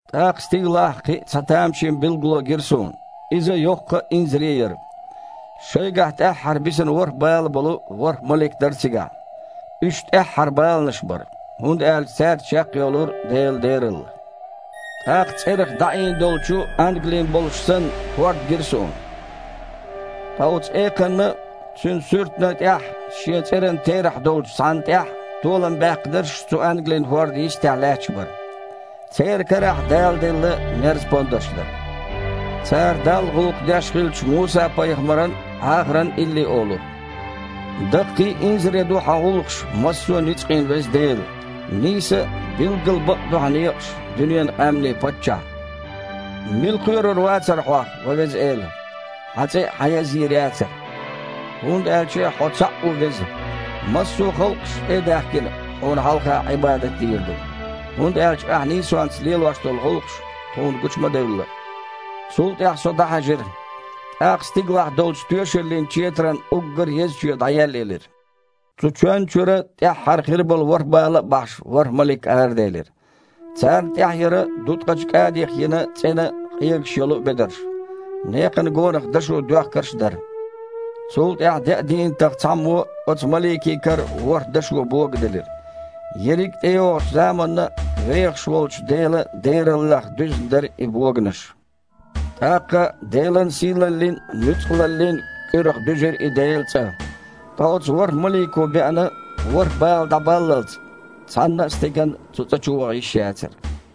ТІаккха стигалахь кхин а цхьа тамашийна билгало гира суна. Иза йоккха а, инзаре а яра. Шайгахь тІаьххьара бисина ворхІ бала болу ворхІ малик а дара цигахь. Уьш тІаьххьара баланаш бара, хІунда аьлча цаьрца чекхйолура Делан дералла. ТІаккха цІерах дІаийна долчу ангалин болуш санна, хІорд гира суна. Ткъа оцу экханна а, цуьнан суьртана а тІехь – шен цІеран терахь долчу цхьанна тІехь – толам баьккхинарш цу ангалин хІордана йистехь лаьтташ бара. Церан карахь Дала делла мерз-пондарш дара. Цара Далла гІуллакх деш хиллачу Муса-пайхамаран а, Іахаран а илли олура: «Даккхий а, инзаре а ду Хьан гІуллакхаш, массо а ницкъийн Веза Дела! Нийса а, билггал бакъ а ду Хьан некъаш, дуьненан къаьмнийн Паччахь! Мила кхоьрур вацара Хьох, ва Веза Эла? Хьан цІе а хьан язйийр яцара? ХІунда аьлча Хьо цхьаъ ву веза! Массо а халкъаша, тІе а даьхкина, Хьуна хьалха Іибадат дийр ду. ХІунда аьлча Ахь нийсонца лелош долу гІуллакхаш тхуна гучу ма девлла». Цул тІаьхьа со дІахьаьжира. ТІаккха стигалахь долчу тоьшаллин Четаран уггар а еза чоь дІаеллаелира. Цу чоьнна чуьра, тІаьххьара хир болу ворхІ бала а бахьаш, ворхІ малик араделира. Царна тІехь яра дуткъачу кІадих йина цІена а, къегаш йолу а бедарш. Некхана гонах дашо доьхкарш а дара. Цул тІаьхьа деа дийнатах цхьаммо оцу маликийн кара ворхІ дашо бога делира. Ерриг а тІейогІучу заманна а вехаш волчу Делан дераллех дуьзна дара и боганаш. ТІаккха Делан сийлаллин а, нуьцкъалаллин а кІуьрах дуьзира и Делан цІа. Ткъа оцу ворхІ малико беана ворхІ бала дІабаллалц, цхьанна а стеган цу цІа чу ваха йиш яцара.